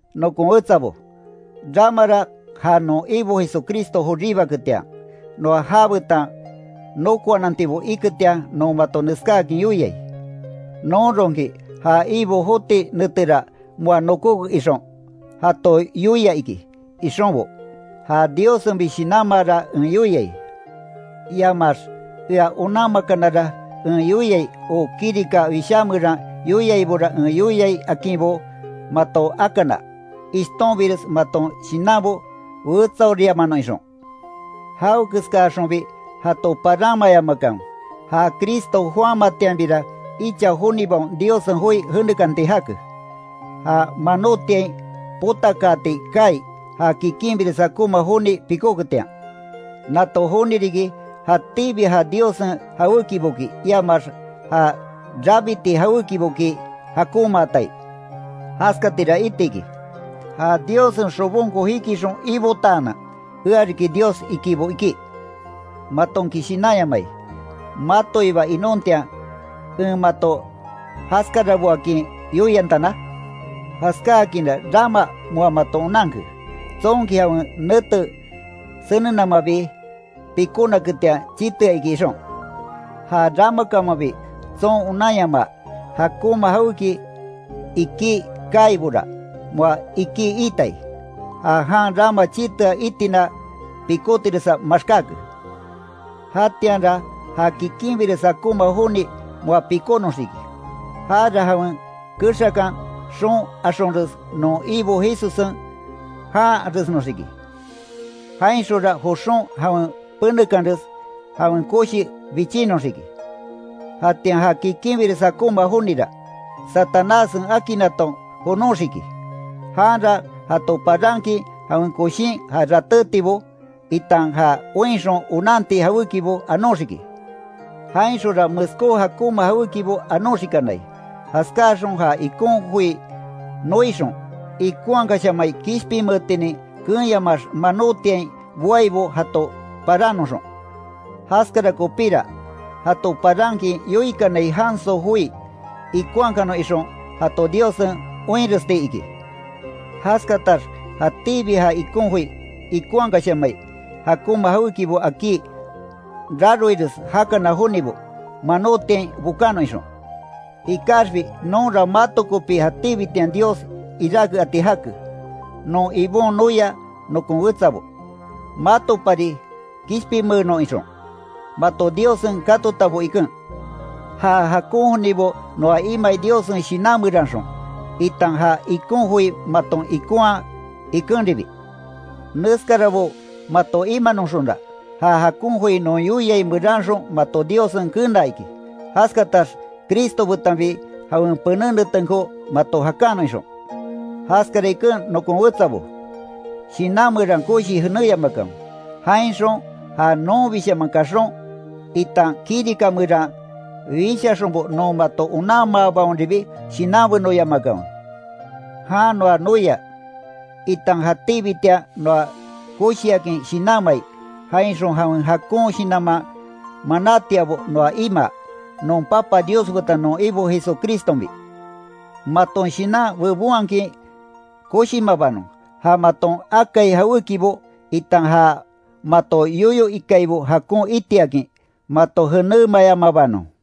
Nokon wetsabo, ramara ja non Ibo Jesucristo joribaketian, noa jabetan nokoanantibo iketian non mato neskáakin yoiai: Nonronki ja Ibo joti netera moa nokóke ixon, jato yoia iki ixonbo, ja Diossenbi shinanmaara en yoiai, iamax ea onanmakanara en yoiai o kirika wishá meran yoiaibora en yoiai akinbo mato akana, ishtonbires maton shinanbo wetsaoriamanon ixon. Jawekeskaxonbi jato paranmayamakanwe, ja Cristo joamatianbira icha jonibaon Diossen joi jenekanti jake, ja manotiain potakaati kaai, ja kikinbires jakonma joni pikóketian. Nato joni riki, jatíbi ja Diossen jawékiboki, iamax ja rabiti jawékiboki jakonmaatai. Jaskatira iti iki, ja Diossen xobonko jikixon ibotaanan, ea riki Dios ikibo ikí. ¿Matonki shinanyamai, matoiba inontian en mato jaskaraboakin yoiantana? Jaskáakinra rama moa maton onanke, tsonki jawen nete senenamabi pikónaketian chitea iki ixon. Ja ramakamanbi tson onanyama jakonma jawéki ikí kaaibora, moa ikí itai, ja jan rama chitea itina pikótiresa maxkáke. Jatianra ja kikinbires jakonma joni moa pikónoxiki, jara jawen kexakan xoon axonres non Ibo Jesussen janharesnoxiki, jainxonra joxon jawen penekanres jawen koshi bichinoxiki. Jatian ja kikinbires jakonma jonira, Satanássen akinnaton jonoxiki. Janra jato parankin jawen koshin ja ratétibo, itan ja oinxon onanti jawékibo anoxiki. Jainxonra meskó jakonma jawékibo anoxikanai, jaskáaxon ja ikon joi noixon, ikonhakashamai kishpinmeetinin keenyamaax manotiain boaibo jato parannoxon. Jaskara kopíra, jato parankin yoikanai janso joi ikonhakanon ixon, jato Diossen oinrestiki. Jaskatax jatíbi ja ikon joi ikonhakashamai, jakonma jawékibo akí raroires jakana jonibo, manotiain bokanon ixon. Ikaxbi nonra mato kopi jatíbitian Dios iráke ati jake, non Ibon noia nokon wetsabo; matopari kishpinmeenon ixon mato Diossen katotabo iken. Ja jakon jonibo noa imai Diossen Shinan meranxon, itan ja ikon joi maton ikonhaa ikenribi. Neskarabo mato imanoxonra, ja jakon joi non yoiai meranxon mato Diossen kenaa iki. Jaskatax Cristo betanbi jawen pené netenko mato jakanon ixon. Jaskara iken nokon wetsabo, shinan meran koshii jenéyamakanwe, jainxon ja nonbishaman kaxon, itan kirika meran wishaxonbo non mato onanmaabaonribi shinanbenoyamakanwe. Jan noa noia, itan jatíbitian noa koshiakin shinanmai, jainxon jawen jakon shinanman manátiabo noa imaa, non Papa Dios betan non Ibo Jesucristonbi, maton shinan bebonhakin koshimabanon, ja maton akai jawékibo, itan ja mato yoyo ikaibo jakon itiakin mato jenémayamabanon.